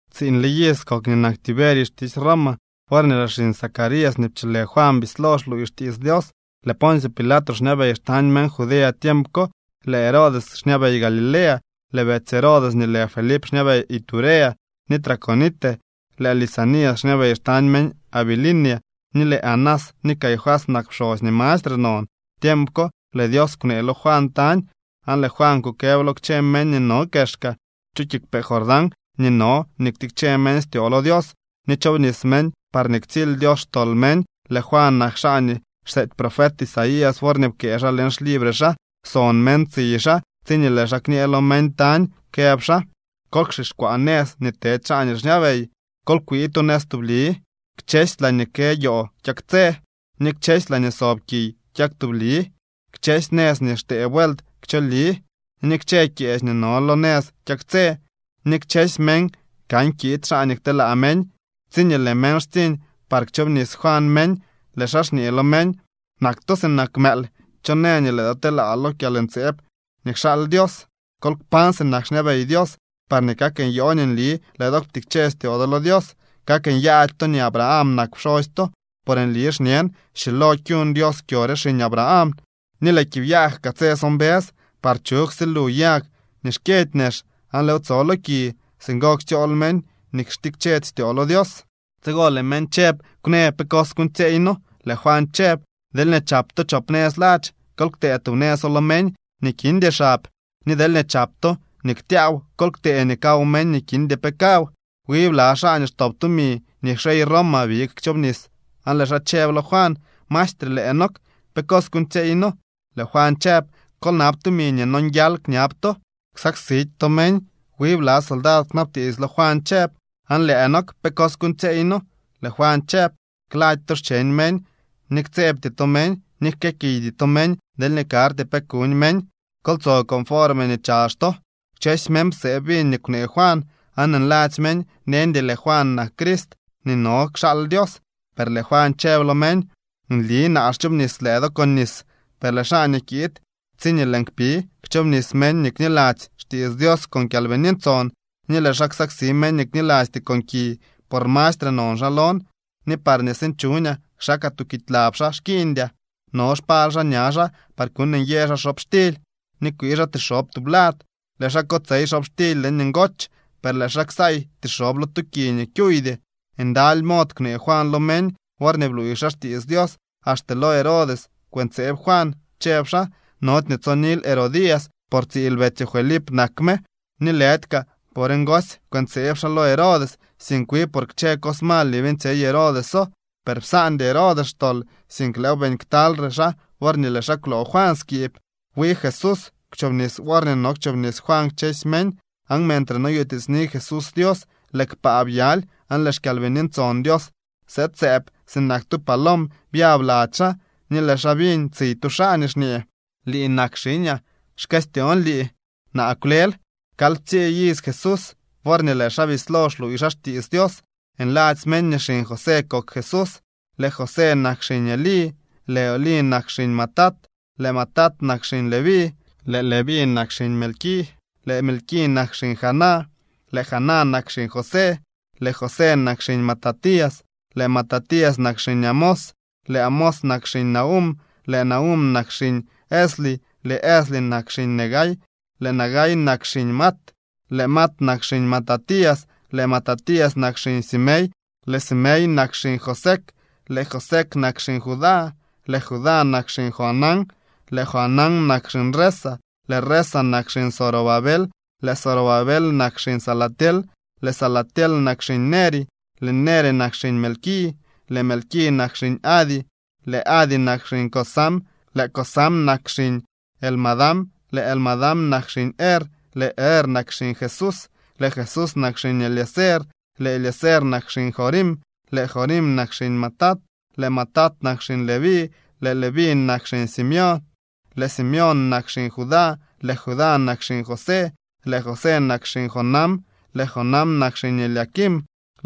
Tsiiñle iz kok nii nak Tiberio xtisy Roma worñee lëë xiñ Zacarías nii pcholë Juan bislo xluuy xtiits Dios. Lëë Poncio Pilato xñabey xtañ meñ Judea tiemp ko. Lëë Herodes xñabey Galilea, lëë betsy Herodes nii lë Felip xñabey Iturea ni Traconite, lëë Lisanias xñabey xtañ meñ Abilinia, ni lëë Anás ni Caifás nak pxosy nii mastre non. Tiemp ko lëë Dios kwnee lo Juan tañ. Aan lëë Juan kukëb lo kchë meñ nii no kexka chu kiigwpee Jordán nii no nii ktikche meñ styoo lo Dios ni chobnis meñ, parñee ktsily Dios xtol meñ. Lëë Juan nak xaa nii xseety profet Isaías worñee pkëë xaa leñ xlibre xaa: Son meñ tsiy xaa tsiñee lëë xaa kñee lo meñ tañ, këb xaa: “Kol kxixkwaa nëz nii tedy xaa nii xñabey. Kol kwii tu nëz tubli. Kchësy laañee kë yoo kyaktsë, ni kchësy laañee sob kiy kyak tubli, kchësy nëz nii xtee vuelt kchooli, ni kchë kyeech nii no lo nëz kyaktsë. Ni kchësy meñ kan kiid xaa nii kteelaa meñ.” Tsiñee lëë meñ xtsiñ par kchoobnis Juan meñ, lëë xaa xñee lo meñ: —¡Nak to sinak mëël! ¿Cho në nii lëë do telaa lo kyalntseeb nii kxaal Dios? Kol kpañ sinak xñabey Dios parñee kak nyoo nii nli lëë do ptikche styoo do lo Dios. Kak nyaady to nii Abraham nak pxosy to. Por nli xñen schilo kuñ Dios kyo re xiñ Abraham. Ni lëë kiib yag kaa tse so mbës parñee chug silu yag nii xkyëdy nex, aan lëëw tso lo ki. Singo ktsyool meñ nii xtikchedy styoo lo Dios. Tsigo lëë meñ chëb: —Kwnë pe cos kuuñtsyeey noo. Lëë Juan chëb: —Deelñee chap to chop nëz ladx, kol ktee tub nëzo lo meñ nii kindy xab. Ni deelñee chap to nii ktyaaw, kol ktee nii kaw meñ nii kindy pe kaw. Wi bla xaa nii xtop tumi nii xyey Roma big chobnis, aan lëë xaa chëb lo Juan: —Maestre, lëë nook, ¿pe cos kuuñtsyeey noo? Lëë Juan chëb: —Kol nab tumi nii nonguial kñab to. Ksaksidy to meñ. Wi bla soldad kwnabtiits lo Juan chëb: —Aan lëë nook, ¿pe cos kuuñtsyeey noo? Lëë Juan chëb: —Klady to xcheñ meñ, ni ktsebty to meñ, ni jkëëkiydy to meñ deelñee karty pe kuñ meñ. Kol tso conforme nii chazh to. Kchësy meñ psee biñ nii kwnee Juan, aan nladzy meñ neñdy lëë Juan nak Crist nii no kxaal Dios. Per lëë Juan chëb lo meñ: —Nli naa xchoobnis lëë do con nis, per lëë xaa nii kiid tsiñee lëën kpi kchoobnis meñ nii kniladzy xtiits Dios con Kyalbini Ntson, ni lëë xaa ksaksi meñ nii knilasty con ki. Por mastre non xaa lon, ni parñee sinchuñaa kxakaa tuukidy lab xaa xkiiñdyaa. No xpal xaa ña xaa par kuñ nyë xaa xobxtily ni kwii xaa tixob tublad. Lëë xaa kotsey xobxtily leñ ngoch, per lëë xaa ksaay tixob lo tu ki nii kyuuydy. Ndaly mod kwnee Juan lo meñ worñee bluuy xaa xtiits Dios. Axte lo rey Herodes kwëntseeb Juan, chëb xaa: “Nody nii tsonil Herodías, por tsiil betsyoo Felip nak me.” Ni lëdy kaa por ngosy kwëntseeb xaa lo Herodes, sink wi por kchë cos mal nii beeñtsyey Herodeso. Per psaandy Herodes xtol, sink lëëw beeñ ktyalyre xaa worñee lëë xaa kwloo Juan skiib. Wi Jesús kwchobnis worñee no kchoobnis Juan kchësy meñ. Aan mentre noyutiitsni Jesús Dios, lëë kpaa byaly aan lëë xKyalbini Ntson Dios sëëd sëëb sinak tu palom byab lady xaa. Ni lëë xaa biñ tsiy tu xaa nii xñee: —Lii nak xiñaa. Xkëstyoon lii. Naa kwlel. Kalyptsii iz Jesús worñee lëë xaa bislo xluuy xaa xtiits Dios. Nladzy meñ nii xiñ José kok Jesús. Lëë José nak xiñ Elí, lëë Elí nak xiñ Matat, lëë Matat nak xiñ Leví, lëë Leví nak xiñ Melqui, lëë Melqui nak xiñ Jana, lëë Jana nak xiñ José, lëë José nak xiñ Matatías, lëë Matatías nak xiñ Amós, lëë Amós nak xiñ Nahúm, lëë Nahúm nak xiñ Esli, lëë Esli nak xiñ Nagai, lëë Nagai nak xiñ Maat, lëë Maat nak xiñ Matatías, lëë Matatías nak xiñ Semei, lëë Semei nak xiñ Josec, lëë Josec nak xiñ Judá, lëë Judá nak xiñ Joanán, lëë Joanán nak xiñ Resa, lëë Resa nak xiñ Zorobabel, lëë Zorobabel nak xiñ Salatiel, lëë Salatiel nak xiñ Neri, lëë Neri nak xiñ Melqui, lëë Melqui nak xiñ Adi, lëë Adi nak xiñ Cosam, lëë Cosam nak xiñ Elmadam, lëë Elmadam nak xiñ Er, lëë Er nak xiñ Jesús, lëë Jesús nak xiñ Eliezer, lëë Eliezer nak xiñ Jorim, lëë Jorim nak xiñ Matat, lëë Matat nak xiñ Leví, lëë Leví nak xiñ Simeón, lëë Simeón nak xiñ Judá, lëë Judá nak xiñ José, lëë José nak xiñ Jonam, lëë Jonam nak xiñ Eliaquim,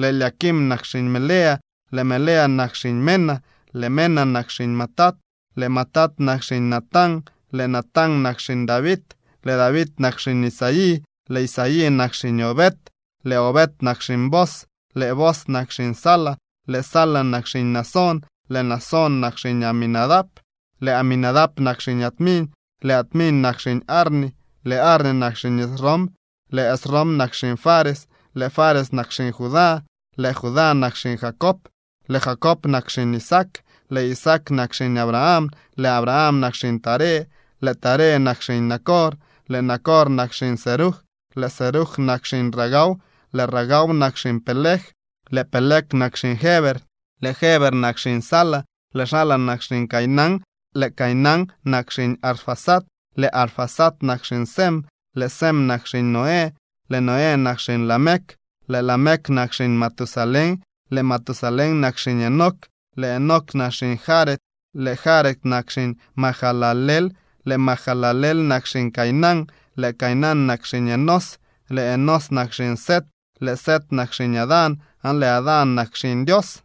lëë Eliaquim nak xiñ Melea, lëë Melea nak xiñ Mena, lëë Mena nak xiñ Matata, lëë Matata nak xiñ Natán, lëë Natán nak xiñ David, lëë David nak xiñ Isaí, lëë Isaí nak xiñ Obed, lëë Obed nak xiñ Booz, lëë Booz nak xiñ Sala, lëë Sala nak xiñ Naasón, lëë Naasón nak xiñ Aminadab, lëë Aminadab nak xiñ Admin, lëë Admin nak xiñ Arni, lëë Arni nak xiñ Esrom, lëë Esrom nak xiñ Fares, lëë Fares nak xiñ Judá, lëë Judá nak xiñ Jacob, lëë Jacob nak xiñ Isaac, lëë Isaac nak xiñ Abraham, lëë Abraham nak xiñ Taré, lëë Taré nak xiñ Nacor, lëë Nacor nak xiñ Serug, lëë Serug nak xiñ Ragau, lëë Ragau nak xiñ Peleg, lëë Peleg nak xiñ Heber, lëë Heber nak xiñ Sala, lëë Sala nak xiñ Cainán, lëë Cainán nak xiñ Arfaxad, lëë Arfaxad nak xiñ Sem, lëë Sem nak xiñ Noé, lëë Noé nak xiñ Lamec, lëë Lamec nak xiñ Matusalén, lëë Matusalén nak xiñ Enoc, lëë Enoc nak xiñ Jared, lëë Jared nak xiñ Mahalaleel, lëë Mahalaleel nak xiñ Cainán, lëë Cainán nak xiñ Enós, lëë Enós nak xiñ Set, lëë Set nak xiñ Adán, aan lëë Adán nak xiñ Dios.